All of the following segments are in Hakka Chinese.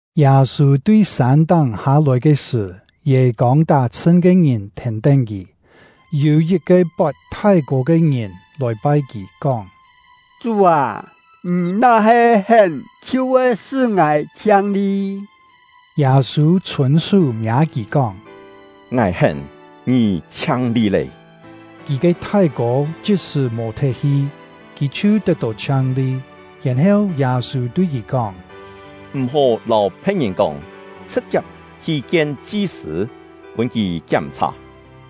Yâ-sû tui sân-táng hâ-lòi ke sṳ̀, yê-kông tá-chhṳn ke ngìn thèn-tén kì. Yû yit-ke pot thái-kô ke ngìn lòi pai kì, kóng: “Chú â, ngì na-he hén, chhiu voi sṳ́ ngài chhiang-li.” Yâ-sû chhûn-sú miâ kì, kóng: “Ngài hén, ngì chhiang-li lé!” Kì ke thái-kô chit-sṳ̀ mò-thet hi, kì chhiu tet-tó chhiang-li. Yèn-heu, Yâ-sû tui kì kóng: “M̀-hó lâu phe̍t-ngìn kóng; chhṳ̍t-chiap hi kien chi-sṳ̂, pûn kì kiám-chhà,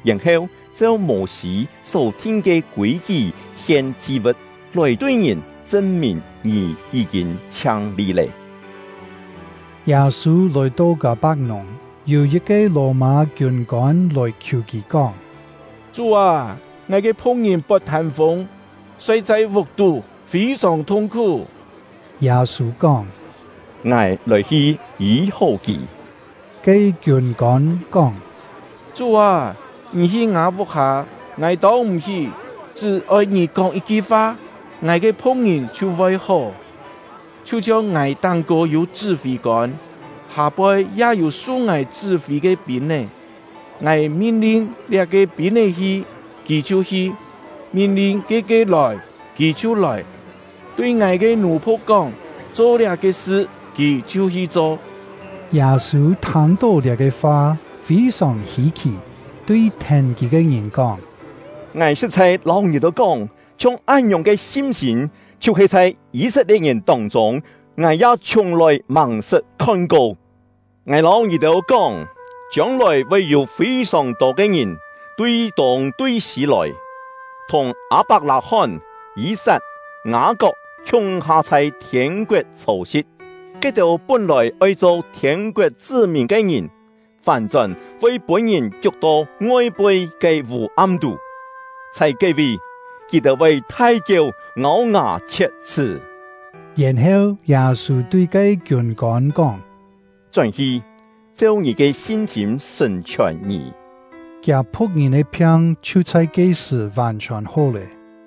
yèn-heu cheu Mô-sî só-thin ke kûi-kí hien chi-vu̍t, lòi tui ngìn chṳn-mìn ngì yí-kîn chhiang-li lé.” Yâ-sû lòi-to Kâ-pak-nùng, yû yit-ke Lò-mâ kiûn-kôn lòi khiù kì, kóng: “Chú â, ngài ke phu̍k-ngìn pot thân-fûng, soi chhai vuk-tú, fî-sòng thung-khú.” Yâ-sû kóng: “Ngài lòi-hi yî-hó kì.” Ke kiûn-kôn kóng: “Chú â, ngì hi ngâ vuk-hâ, ngài tông m̀-hí; chṳ́-oi ngì kóng yit-ki fa, ngài ke phu̍k-ngìn chhiu voi hó. Chhiu-chhiong ngài táng-kô yû chṳ́-fî-kôn, hâ-poi ya yû su ngài chṳ́-fî ke pîn-é. Ngài min-lin liá-ke pîn-é hi, kì chhiu hi; min-lin ke-ke lòi, kì chhiu lòi; tui ngài ke nù-phu̍k kóng ‘Cho liá-ke sṳ’, kì chhiu hi cho.” Yâ-sû thâng-tó liá-ke fa, fî-sòng hî-khì, tui thèn kì ke ngìn kóng: “Ngài sṳ̍t-chhai lâu ngì-têu kóng, chhiong án-ngiòng ke sin-sîm, chhiu-he chhai Yî-set-lie̍t-ngìn tông-chûng, ngài ya chhiùng-lòi màng-sṳt khon-ko! Ngài lâu ngì-têu kóng, chiông-lòi voi yû fî-sòng tô ke ngìn tui tûng, tui sî lòi, thùng Â-pak-lâ-hón, Yî-sat, Ngâ-kok khiung-ha chhai thiên-koet chhô-si̍t. Ke-têu pún-lòi oi cho thiên-koet chṳ́-mìn ke ngìn, fán-chón voi pûn-ngìn kiuk-to ngoi-poi ke vû-am tú; chhai ke-vi, kì-têu voi thai-kieu, ngâu-ngà chhiet-chhṳ́.” Yèn-heu, Yâ-sû tui ke kiûn-kôn kóng: “Chón-hi, cheu ngì ke sin-sîm sṳ̀n-chhiòn ngì!” Kiâ phu̍k-ngìn ke phiang chhiu chhai ke-sṳ̀ vàn-chhiòn hó lé.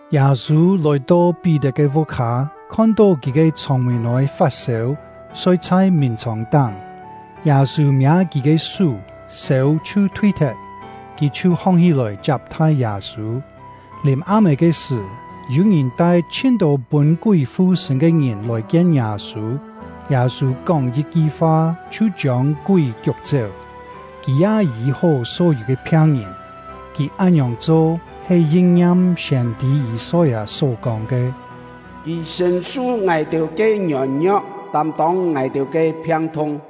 Yâ-sû lòi-to Pí-tet ke vuk-hâ, khon-tó kì ke chhông-mîn-ôi fat-sêu, soi chhai mìn-chhòng-táng. Yâ-sû miâ kì ke sú, sêu chhiu thui-thet, kì chhiu hong-hí-lòi chiap-thai Yâ-sû. Lìm-am-é ke sṳ̀, yû-ngìn tai chhin-tô pûn-kúi fu-sṳ̂n ke ngìn lòi-kien Yâ-sû. Yâ-sû kóng yit-ki fa chhiu chiông kúi kiuk-chéu; kì ya yî-hó só-yû ke phiang-ngìn. Kì án-ngiòng cho, he yin-ngiam siên-tî Yî-soi-â só-kóng ke: “Kì sṳ̀n-su ngài-têu ke ngiôn-ngio̍k, tâm-tông ngài-têu ke phiang-thung.”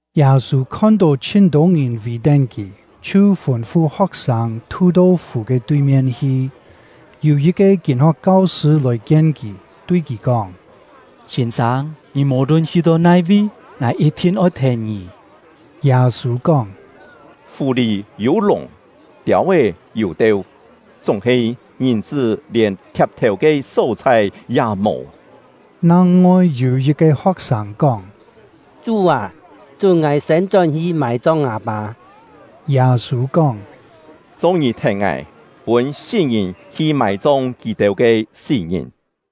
Yâ-sû khon-tó chhin-tô ngìn vì-tén kì, chhiu fûn-fu ho̍k-sâng thu-to fù ke tui-mien hi. Yû yit-ke kîn-ho̍k kau-sṳ̂ lòi-kien kì, tui kì kóng: “Sîn-sâng, ngì mò-lun hi-to nai-vi, ngài yit-thin oi thèn ngì.” Yâ-sû kóng: “Fù-lì yû lùng, tiâu-é yû teu, chúng-he Ngìn-chṳ́ lièn thiap-thèu ke só-chhai ya mò.” Nang-ngoi yû yit-ke ho̍k-sâng kóng: “Chú â, chún ngài siên chón-hi mài-chong ngâ-pâ.” Yâ-sû kóng: “Cho-ngì thèn ngài, pûn sí-ngìn hi mài-chong kì-têu ke sí-ngìn!”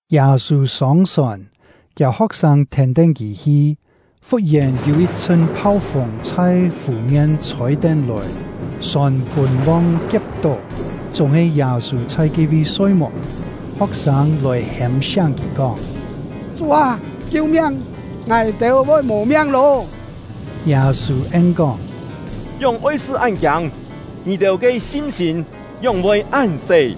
Yâ-sû sông-sòn, kiâ ho̍k-sâng thèn-tén kì hi. Fut-yèn, yû yit-chhṳn phau-fûng chhai fù-mien chhôi-tén lòi, sòn pûn long kie̍p-tó, chúng-he Yâ-sû chhai ke-vi soi-muk. Ho̍k-sâng lòi hêm-siáng kì, kóng: “Chú â, kiu-miang! Ngài-têu voi mò-miang lô!” Yâ-sû en-kóng: “Ngióng oi-sṳ́ án-kiâng? Ngì-têu ke sin-sîm ngióng voi án-se!”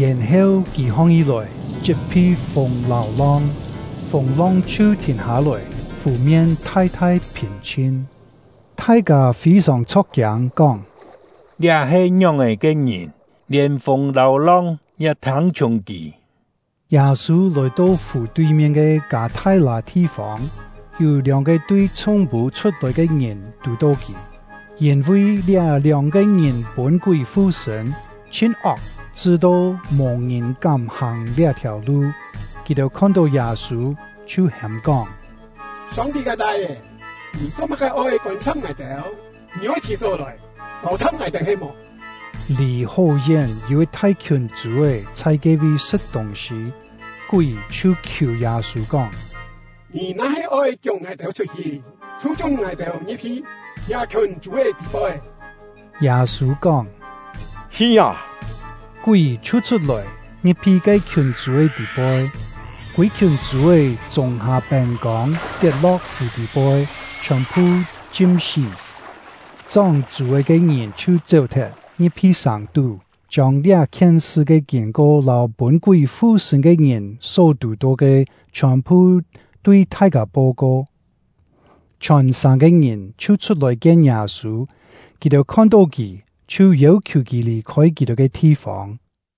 Yèn-heu kì hong-hí-lòi, chit-phi fûng lâu long, fûng-long chhiu thìn hâ-lòi, fù-mien thai-thai phìn-chhin. Thai-kâ fî-sòng chho̍k-kiâng, kóng: “Liá he ngióng-è ke ngìn? Lièn fûng lâu long ya thâng-chhiùng kì!” Yâ-sû lòi-to fù tui-mien ke Kâ-thai-lâ thi-fông; yû lióng-ke tui chhúng-pû chhut-lòi ke ngìn tù-tó kì. Yîn-vi liá lióng-ke ngìn pûn-kúi fu-sṳ̂n, chhin-ok, chṳ-to mò-ngìn kám hàng liá-thiàu lu. Kì-têu khon-tó Yâ-sû, chhiu hêm-kóng: “Song-ti ke Lai-é, ngì cho-má-ke oi kôn-sa̍p ngài-têu? Ngì oi thì-chó lòi châu-tha̍p ngài-têu he-mò?” Lì hó-yén yû yit thai-khiùn chû-é chhai ke-vi sṳ̍t tûng-sî. Kúi chhiu khiù Yâ-sû, kóng: “Ngì na-he oi kiuk ngài-têu chhut-hi, chhiu chún ngài-têu ngi̍p-hi liá-khiùn chû-é tî-poi.” Yâ-sû kóng: “Hi â!” Kúi chhiu chhut-lòi, ngi̍p-hi ke-khiùn chû-é tî-poi; kûi-khiùn chû-é chûng-hâ pên-kông, tiet-lo̍k fù tî-poi, chhiòn-phu chim-sí. Chóng chû-é ke ngìn chhiu chéu-thet, ngi̍p-hi sàng-tú, chiông liá-khien sṳ ke kîn-ko lâu pûn-kúi fu-sṳ̂n ke ngìn só tù-tó ke chhiòn-phu tui thai-kâ po-ko. Chhiòn-sàng ke ngìn chhiu chhut-lòi kien Yâ-sû; kì-têu khon-tó kì, chhiu yêu-khiù kì lì-khôi kì-têu ke thi-fông.